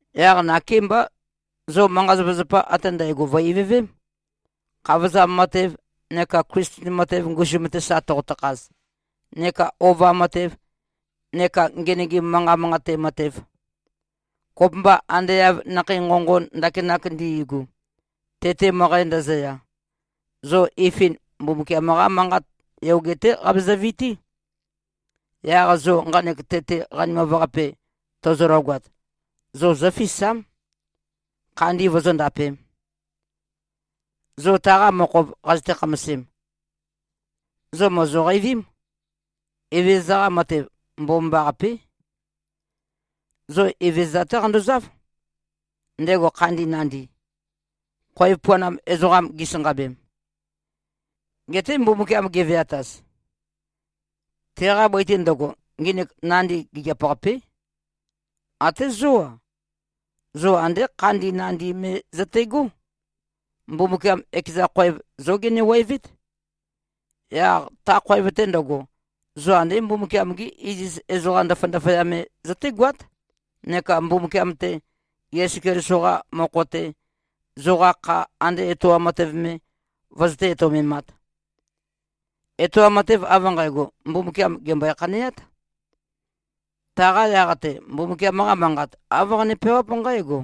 Yaq nakémbá, zo manqa-zapazapa ate ndægo vø̀-ivøvém, khavozam matev neka Klisten matev ngusum-te sa toqotø-khaz neka ova matev neka ngenøgim manqat manqate matev. Kopømba ande av nakhei nqonqon ndakinak ndi꞉gu, tete møqæ ndøzøya, zo ifin Mbumbukiam-qa Manqat yoge-té qabezø-vití. Yaq zo nqanek tete qanimav-qape tozologat, zo zófisám, khandi vozóndapēm. Zo taqa mokhov qazøte-khamasem, zo mòzoqeivím, Evezøza-qa matev mbomambaqapé. Zo Evezøza-té qandozáv, ndego khandin nandi, khoev puanam ezoqam gisanqabem, gete Mbumbukiam geveataz. Teqa bøi-te ndøgo, nginik nandi, gigiap-qapé. Até zó-a, zo andé khandin nandi me zøte꞉gó. Mbumbukiam, ekeza khoev, zó genewevét. Yaq ta khoev-te ndøgo, zo andé Mbumbukiam-gí iziz ezoqa ndaføya-ndaføya me zøtégoát, neka Mbumbukiam-te, Yesu Keliso-qa mokho-te, zoqa kha ande etoam matev me vøzøté-etoumemāt. Etoam matev av nqægo, Mbumbukiam, gèmbøe-khaneát. Taqa yaq-te, Mbumbukiam-qa Manqat, āv qane-peawáp nqǽgo,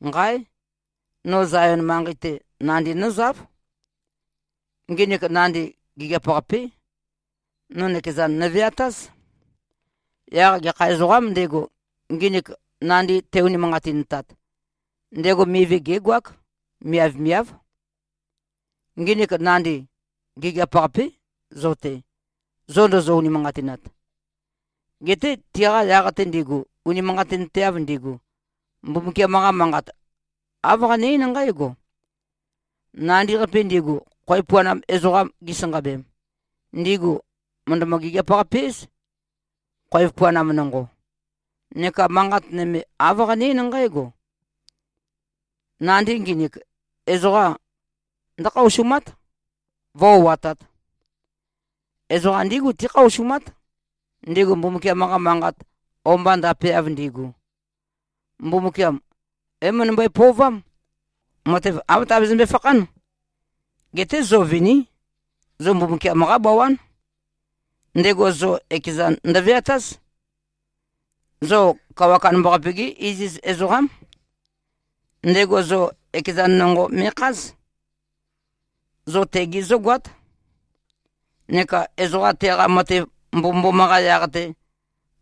“Nqáe! No Zayon manqei-te, nandi nózáv. Nginik nandi, gigiap-qapé. No nøkezan nøveatáz. Yaq gekha ezoqām ndego, nginik nandi te-unimanqatintat, ndego mivi gégoák. Miavmiáv.” Nginik nandi, gigiap-qapé zo-te, zo ndozo-unimanqatinat. Geté tiqa yaq-te ndigu, unimanqatinteav ndigu, Mbumbukiam-qa Manqat, āv qane-eín nqǽgo, “Nandi-qapi ndigu, khoev puanam ezoqam gisanqabem, ndigu mø̀ndømø-gigiap-qape-éz, khoev puanam nonqo.” Neka manqat nøme, āv qane-eín nqǽgo, “Nandi nginik, ezoqa ndǿkhaosumát, vǿ-o꞉atāt.” Ezoqa ndígu tíkhaosumát, ndigu Mbumbukiam-qa manqat o-mba ndapeav ndigu. Mbumbukiam é-møndømbøe-pøovám, matev āv tabezømbe-fakhán. Geté zo viní. Zo Mbumbukiam-qá bawán. Ndego zo ekezan ndøveatáz. Zo Kawa Kandambaqape-gí iziz ezoqám. Ndego zo ekezan nonqo me꞉kház. Zo tegi zógoát, neka ezoqa teqa matev mbomømboma-qa yaq-te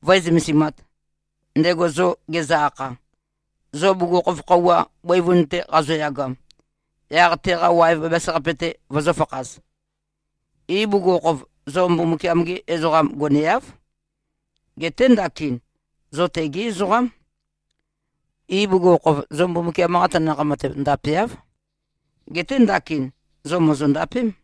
vǿe-zømesimāt, ndego zo gezø-akha, zo bugukhokhof khøuwa bøivun-te qazoyagam, yaq teqa waev bæbæs-qape-te vozōfakhaz. Ibugukhokhof, zo Mbumbukiam-gi ezoqam goneáv. Geté ndakin, zo tegí ezoqám. Ibugukhokhof, zo Mbumbukiam-qa tanakh matev ndapeáv. Geté ndakin, zo mòzondapém.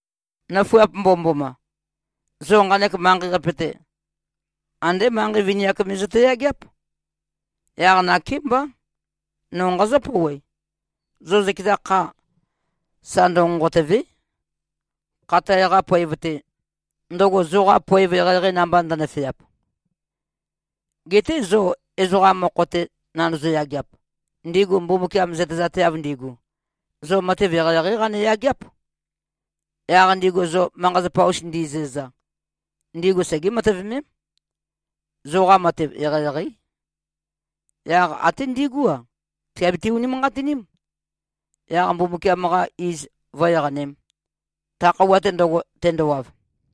Nøfuap mbomømboma! Zo nqanek manqei-qape-te, andé manqei vini-ak me zøte-yageáp. Yaq nakémbá, no nqazǿ-pouwe: Zo zøkeza kha, sa ndønqonqotø̀ve᷄, khatae-qa poev-te, ndøgo zoqa poev eqeieqei namba ndønøfeap. Geté zo ezoqa mokho-te nandozo-yageap, ndigu Mbumbukiam zøtezateav ndigu, zo matev eqeieqeí qane-yageáp. Yaq ndigu zo manqa-zapa-us ndizæza, ndigu segé-matøvemém, zoqa matev eqeieqeí. Yaq até ndigú-a, tìabiti-unimanqatiním, yaq Mbumbukiam-qa iz vǿ-eqanēm, ta khøuwa-te ndøgo, tendowav.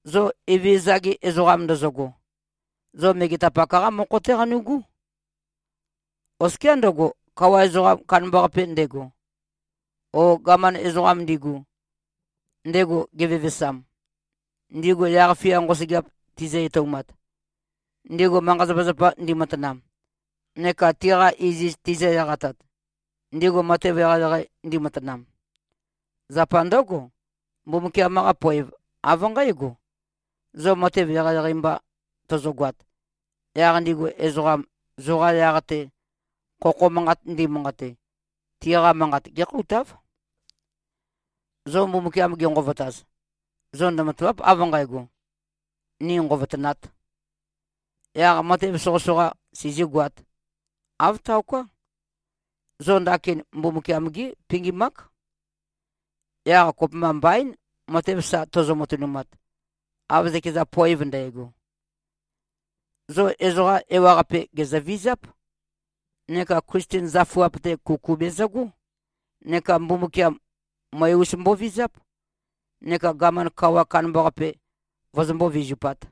Zo Evezøza-gi ezoqam ndozogo, zo megetapak-qá mokho-té qanu꞉gú. Oskiá ndøgo, kawa ezoqam kandambaqape ndego, o gaman ezoqam ndigu, ndego gevevesam, ndigu yaq-fia nqosøgeap tizø-etoumat, ndigu manqa-zapazapa ndimatanam, neka tiqa iziz tizø-eqatat, ndigu matev eqeieqei ndimatanam. Zapa ndǿgo, Mbumbukiam-qa poev av nqǽgo: Zo matev eqeieqei mba tozogoat, yaq ndigu ezoqam, zoqa yaq-te khokho manqat ndimanqate, tiqa manqat gé꞉khoutáv. Zo Mbumbukiam genqovotaz, zo ndømatàva᷄p, av nqægo, “Ni nqovotønāt. Yaq matev soqøsoqa sizīgoāt.” Āv taoká. Zo ndakin Mbumbukiam-gí pingim-ák. Yaq kopømba mbaín, matev sa tozo-matønumat, av zøkeza poev ndægo. Zo ezoqa ewaqape gèzøvizáp, neka Klisten zøfuap-te kuku bezøgó, neka Mbumbukiam, møe-us mbovizáp, neka gaman kawa kandambaqape vozombó-vizupāt.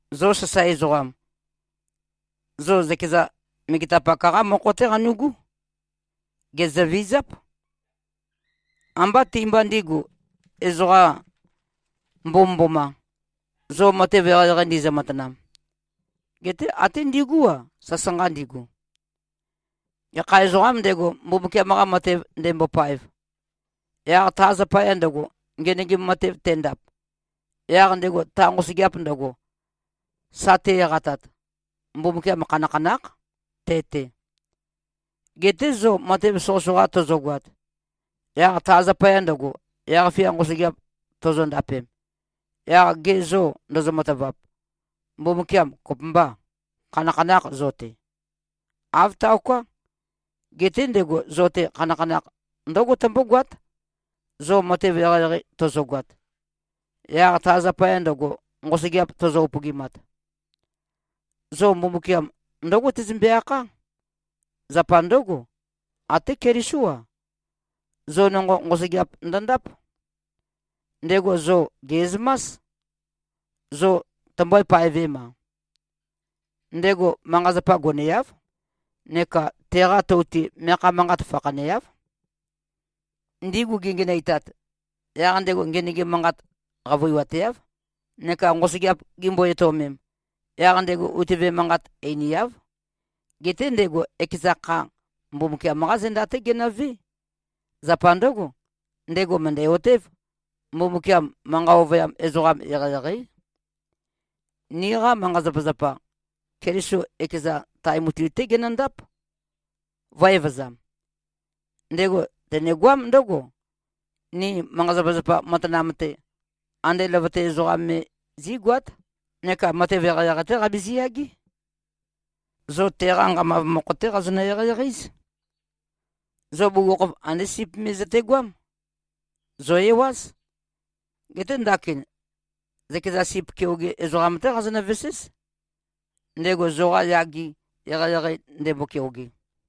Zo sasae ezoqam, zo zøkeza megetapak-qá mokho-té qanu꞉gú. Gèzøvizáp. Ambá ti-mba ndīgu, ezoqa mbomømboma, zo matev eqeieqei ndizø-matanam, geté até ndigú-a, sasanqa ndigu. Gekha ezoqām ndego, Mbumbukiam-qa matev ndembopaev, yaq ta zapaya ndøgo, ngenøgim matev tendap, yaq ndego ta nqosøgeap ndøgo sa te-eqatat, Mbumbukiam khanakhanákh te-te. Geté zo matev soqøsoqa tozogoat, yaq ta zapaya ndøgo, yaq-fia nqosøgeap tozondapem, yaq ge zô ndozo-matavap, Mbumbukiam kopømbâ, khanakhanâkh zo-te? Āv taoká. Geté ndego zo-te, khanakhanakh ndǿgo tømbógoát, zo matev eqeieqei tozogoat, yaq ta zapaya ndøgo nqosøgeap tozo-upøgimat. Zo Mbumbukiam ndǿgo tezømbe-akhá. Zapa ndǿgo, até Kelisó-a, zo nonqo, nqosøgeap ndøndáp. Ndego zo gè꞉zømás, zo tømbø̄e-paevem-a. Ndego manqa-zapa goneáv, neka teqa tou-te meakha manqat fakhaneáv. Ndigu gingenøitat, yaq ndego ngenøgim manqat qavøiwateáv, neka nqosøgeap gimbo-etøomem, yaq ndego utøve manqat einiáv. Geté ndego ekeza kha, Mbumbukiam-qá zenda-té genøvé. Zapa ndǿgo, ndego mø̀ndæ-otév, Mbumbukiam manqa ovøyam ezoqam eqeieqeí. Niqa manqa-zapazapa, Keliso ekezan, tae mutui-té genøndáp, vø̄-evøzam. Ndego tenegoám ndǿgo: Ni manqa-zapazapa matanam-te, andé løvøte ezoqam me zí꞉goát, neka matev eqeieqei-té qabizi-yagé. Zo teqa nqamav mokho-té qazonø-eqeieqei-éz. Zo bugukhokhof, andé sip me zøtegoám. Zò-ewáz. Geté ndakin zøkeza sip keoge ezoqam-té qazonø-veséz, ndego zoqa yage, eqeieqei ndembo-keoge.